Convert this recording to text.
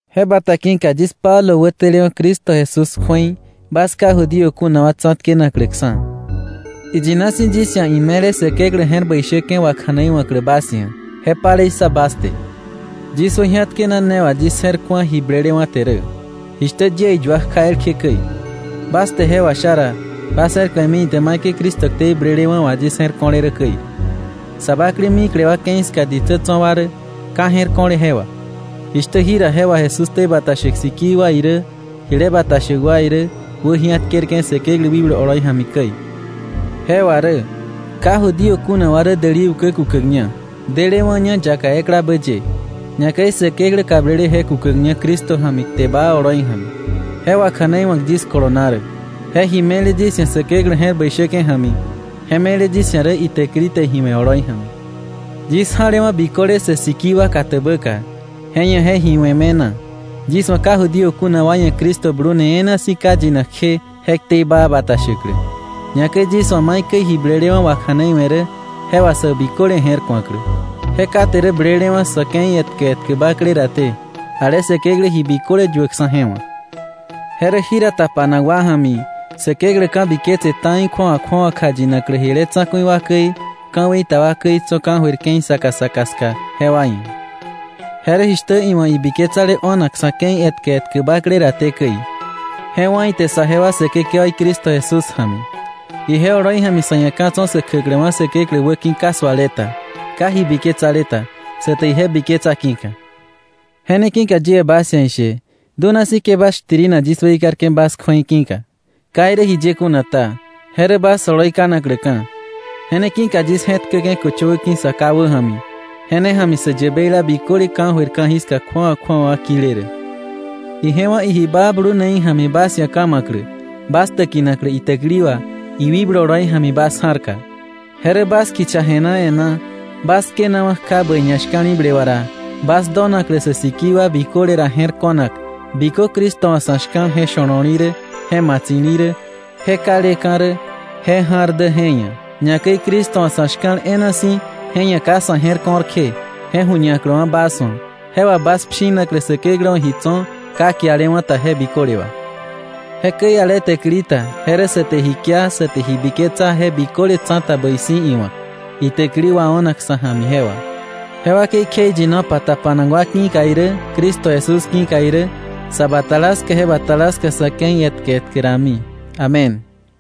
Je bata ki̱ka yis Pablo wätelewa̱ Cristo Jesús ia̱ bas ka Judío kuna wa ki̱ka, iyina si̱ yis ia̱ ime̱le Säkeklä je̱r bäi shäke̱ wakja̱neiwa̱klä bas ia̱, je palei ssa bas te. Yis wäji̱atkena ne wà yis je̱r ku̱a ji blelewa̱ te rä, jishtä yie iyua kja elkje käi. Bas te je washa ra, bas je̱r ku̱emi ite maikäi Cristo ktei blelewa̱ wà yis je̱r ko̱le rä käi. Sa bakle mikle wa ke̱i ska ditsä tso̱ wa rä ka je̱r ko̱le je wà, jishtä jira je wà Jesús ktei bata shäk sikii wa irä jile bata shäk wa irä wäji̱atkerke̱ Säkeklä wikblu oloi ja̱mi käi. Je wà rä: Ka Judío kuna wa rä däli ukä kukäkña, delewa̱ña yaka eklabä ye, ñakäi Säkeklä kablele je kukäkña Cristo ja̱mi kte baa oloi ja̱mi. Je wakja̱neiwa̱k yis kolona rä. Je ji me̱le yis ia̱ Säkeklä je̱r bäi shäke̱ ja̱mi, je me̱le yis ia̱ rä itäkili te ji we̱ oloi ja̱mi. Yis ja̱lewa̱ biköle sä sikii wa katäbäka, je ia̱ je ji we̱ me̱na, yis wa̱ ka Judío kuna wa ia̱ Cristo blune e̱e̱na si̱ ka yinak kje je ktei baa bata shäklä, ñakäi, yis wa̱ maikäi ji blelewa̱ wakja̱neiwe̱ rä je wà sä biköle je̱r ku̱aklä, je kate rä blelewa̱ sa̱ ke̱i etkä etkä bakle raté ale Säkeklä ji biköle yuäkksa̱ je wa̱. Je rä jira tapanak wa ja̱mi, Säkeklä ka̱biketse ta̱i kju̱awa kju̱awa kjayinaklä jile tsa̱ku̱i wa käi, ka̱wei ta wa käi tso̱ ka̱jöir ke̱i saka saka ska jewa ia̱. Je rä jishtä iwa̱ ibiketsale o̱nak sa̱ ke̱i etkä etkä bakle raté käi. Je wá̱ ite saje wa Säkekewaí Cristo Jesús ja̱mi. Ije oloi ja̱mi sa̱ ia̱ ka̱ tso̱ sä kjäkläwa̱ Säkeklä wäki̱ ka suale ta, ka ji biketsale ta, sa te ije biketsa ki̱ka. Je ne ki̱ka yie bas ia̱ ishe dunasi̱ ke bas shtirina yis weikarke̱ bas kju̱ei je ki̱ka. Ka irä jiye kuna ta, je rä bas oloi kanakläka̱. Je ne ki̱ka yis je̱tkäke̱ köchöwä ki̱ Sa Ká wäja̱mi, je ne ja̱mi sä yäbeila biköle ka̱jöir ka̱jiska kju̱awa kju̱awa kile rä, ije wa̱ iji baa bluneí ja̱mi bas ia̱ ka̱ ma̱klä, bas täkinaklä itäkili wà iwikblu oloi ja̱mi bas ja̱rka. Je rä bas kicha je̱na e̱ná bas tkenawa̱ kja bäi ñashka̱li̱ble wà ra, bas donaklä sä sikii wa biköle ra je̱r ko̱nak bikö Cristo wa̱ sa̱ shka̱l je sho̱lo̱li rä, je matsi̱li̱ rä, je kaleka̱ rä, je ja̱r dä je ia̱, ñakäi Cristo wa̱ sa̱ shka̱l e̱e̱na si̱, je ia̱ ka sa̱ je̱r ko̱r kje, je ju̱ñaklä bas wa̱, je wà bas pshinaklä Säkeklä wa̱ ji tso̱ ka kialewa̱ ta je biköle wà. Jekäi ale täkili ta je rä sa te ji kia, sa te ji biketsa je biköle tsa̱ta bäi si̱ iwa̱k, itäkili wao̱nak sa̱ ja̱mi je wà, je wakei kjeiyinopa tapanak wa ki̱ka irä, Cristo Jesús ki̱ka irä, sa batala ska je batala ska sa̱ ke̱i etkä etkä rami. Amén.